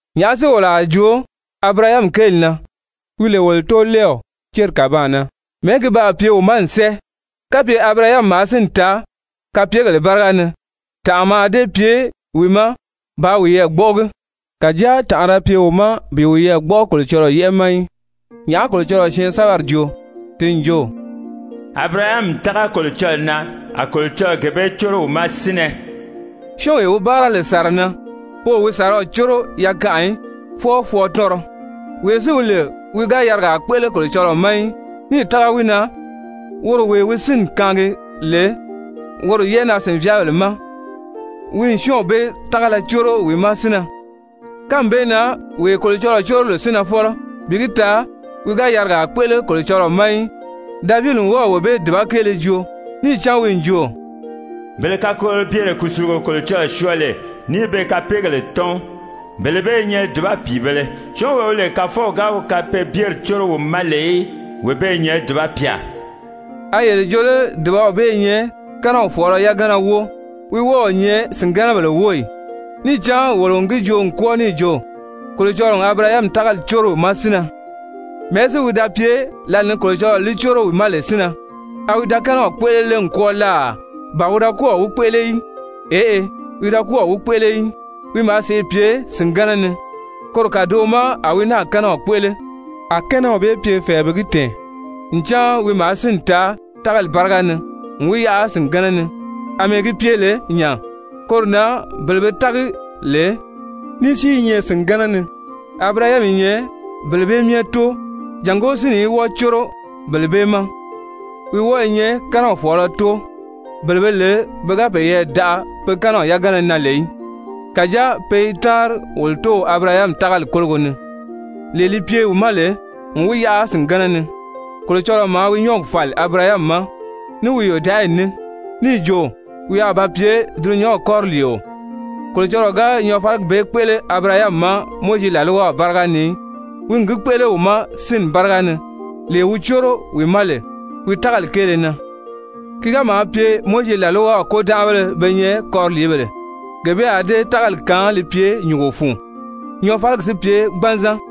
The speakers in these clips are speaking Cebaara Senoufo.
Nyàʔá si wolo a joo Abirahami kéeli na, wi lè wolo tóolɛɛw céri kàbaan na? Mɛ̀ɛ́ ki baa pye wi ma n sɛ́ɛ? Kapye Abirahami maa sínni taa kapyegèle báriga ni, tànʔa mǎà dée pye wi ma bàā wiyɛɛ gbɔ́ʔɔgi. Kàjáa tànʔa da pye wi ma bi wiyɛɛ gbɔ́ʔɔ Kolocɔlɔɔ yɛ́ʔɛ ma í. Nyàʔá Kolocɔlɔɔ syɛɛnsɛbɛri joo? Ti n jo: «Abirahami n tága Kolocɔlɔɔ na, a Kolocɔlɔɔ gee bee córo wi ma sínnɛ.» Syɔ́ɔnwee wi báara lè sàra na, pe o wi sàraw córo yakanʔa í, fwɔɔ fwɔɔtɔnrɔ. Wee si wi lè wi ga yarigaa kpéʔele Kolocɔlɔɔ ma í, níì tága wi na, woro wee wi sínni kaangi lè woro yɛ́ʔɛnaa-sìnvyaabèle ma, wi n syɔ́ɔnw bee tágala córo wi ma sínnɛ. Kánmi bee na wee Kolocɔlɔɔ córo lè sínnɛfɔlɔ bi gi taa wi ga yarigaa kpéʔele Kolocɔlɔɔ ma í, Davidi n wɔ́ɔ̀ wee bee dùba kéele joo. Níì cán wi n jo: «Bele kakolobyere kùsulugo Kolocɔlɔɔ syɔɔ lè níì be kapeegèle tɔ́n, bele bee i nyɛ dùba pìibēle! Syɔ́ɔnwee wi lè Kàfɔw ga wi kapeebyeri córo wi ma lè í, wee bee i nyɛ dùba pyà.» A yele jo lé dùbaw bee i nyɛ kɛ́nɛw fɔ̀ɔlɔ yagana wóo? Wi wɔ́ɔ o nyɛ sìngɛnɛbèle wóo ì? Níì cán wolo n gi joo n kwɔ́ɔ níì jo: «Kolocɔlɔɔ n Abirahami tágali córo wi ma sínnɛ.» Mɛ̀ɛ́ si wi da pye lǎlee ni Kolocɔlɔɔ li córo wi ma lè sínnɛ? A wi da kɛ́nɛw kpéʔele lé n kwɔ́ɔ láà, ba wi da kɔ́ɔ̀ wi kpéʔele í? Eʔe, wi da kɔ́ɔ̀ wi kpéʔele í, wi maa sèʔê pye sìngɛnɛ ni. Koro kàdoʔo ma a wi náà kɛ́nɛw kpéʔele, a kɛ́nɛw bee pye fɛ̀ɛ bi gi tɛ̀ɛn ncan wi maa sínni taa tágali báriga ni n wi yaʔa sìngɛnɛ ni. Amɛɛ gi pye lè nya, koro na bele be tági lè ní si i nyɛ sìngɛnɛ ni, Abirahami i nyɛ bele bee myɛ tóo, jàngó sínni í wɔ́ɔ córo bele bee ma. Wi wɔ́ɔ i nyɛ kɛ́nɛw fɔ̀ɔlɔ tóo, bele be lè pe ga peyɛɛ daʔa pe kɛ́nɛw yagana na lè í, kàjáa pe i táanri wolo tóow Abirahami tágali kólogo ni, lee li pye wi ma lè n wi yaʔa sìngɛnɛ ni. Kolocɔlɔɔ maa wi nyɔ́ɔgi fàli Abirahami ma ní wi yòdaʔayi ní níì jo wi a ba pye dulunyanw kɔriliio, Kolocɔlɔɔ ga nyɔɔfaligi bee kpéʔele Abirahami ma Mowizi làlwaw báriga ni í, wi n gi kpéʔele wi ma sínni báriga ni, lee wi córo wi ma lè wi tágali kéele na. Ki ga maa pye Mowizi làlwaw kôdanʔabéle be nyɛ kɔriliibèle, gee bee a dée tágali kaan li pye nyùngo fun, nyɔɔfaligi si pye gbanzan.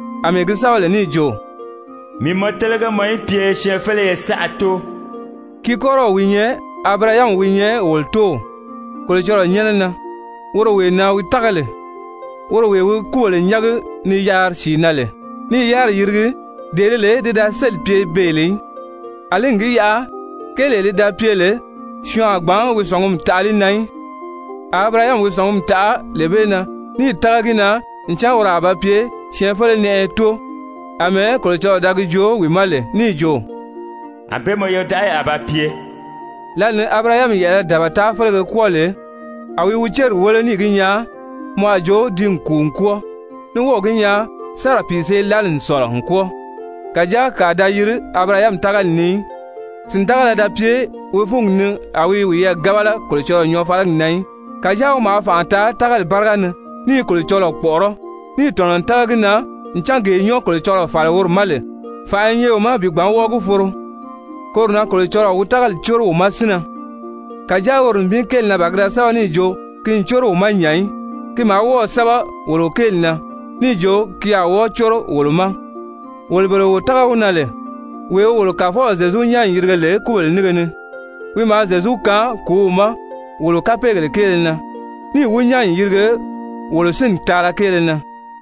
àmɛɛ gi sɛ́bɛ lè níì jo: «Mii n mɔ télege mɔ í pye syɛɛnfeleye saʔa tóo.» Ki kɔ́rɔw wi nyɛ Abirahami wi nyɛ wolo tóow Kolocɔlɔɔ nyɛ́nɛ na, woro wee na wi tága lè, woro wee wi kúbèle nyángi ni yaari sìi na, ní i yáriri yirigi, dee di lè ti da sélì pye beè lè í. Alí n gi yaʔa kéelee li da pye lè syɔɔn a gbǎn wi sɔ̀ngumi taʔa li na í, a Abirahami wi sɔ̀ngumi taʔa lee bee na níì tága gi na ncan woro a ba pye syɛɛnfele-nɛʔɛyɛ tóo, àmɛɛ Kolocɔlɔɔ da gi joo wi ma lè níì jo: «Anbée mɔ yodaʔayi a ba pye.» Lǎli ni Abirahami yɛ̀ʔɛlɛ dabata félege kwɔ́ɔ lè, a wi wi céri wéle níì gi nyaa mɔ a jo ti n kùu n kwɔ́ɔ, ní wɔ́ɔ̀ gi nyaa Sara pìisee-lali n sɔ̀lɔ n kwɔ́ɔ, kàjáa kàa da yiri Abirahami tágali ni í. Sìndagala da pye wi fúngi ni a wi i wiyɛɛ gábala Kolocɔlɔɔ nyɔɔfaligi na í, kàjáa wi maa fànʔa taa tágali báriga ni ní i Kolocɔlɔɔ kpɔ̀ʔɔrɔ́, níì tɔ̀nɔ n tága gi na ncan gee nyɔ́ɔ Kolocɔlɔɔ fàli woro ma lè, fànʔa i nyɛ wi ma bi gbǎn wɔ́ɔ gi foro. Koro na «Kolocɔlɔɔ wi tágali córo wi ma sínnɛ.» Kàjáa woro nibin kéeli na ban ki da sɛ́bɛ níì jo ki n córo wi ma nya í. Ki maa wɔ́ɔ̀ sɛ́bɛ wolo kéeli na níì jo ki a wɔ́ɔ córo wolo ma, wolo bele wo tága wi na lè wee wi wolo Kàfɔw Zyezu nyán n yirige lè kúbèle nínge ni. Wi maa Zyezu kaan kùúw ma wolo kapeegèle kéele na, níì wi nyán n yirige wolo sínni taala kéele na.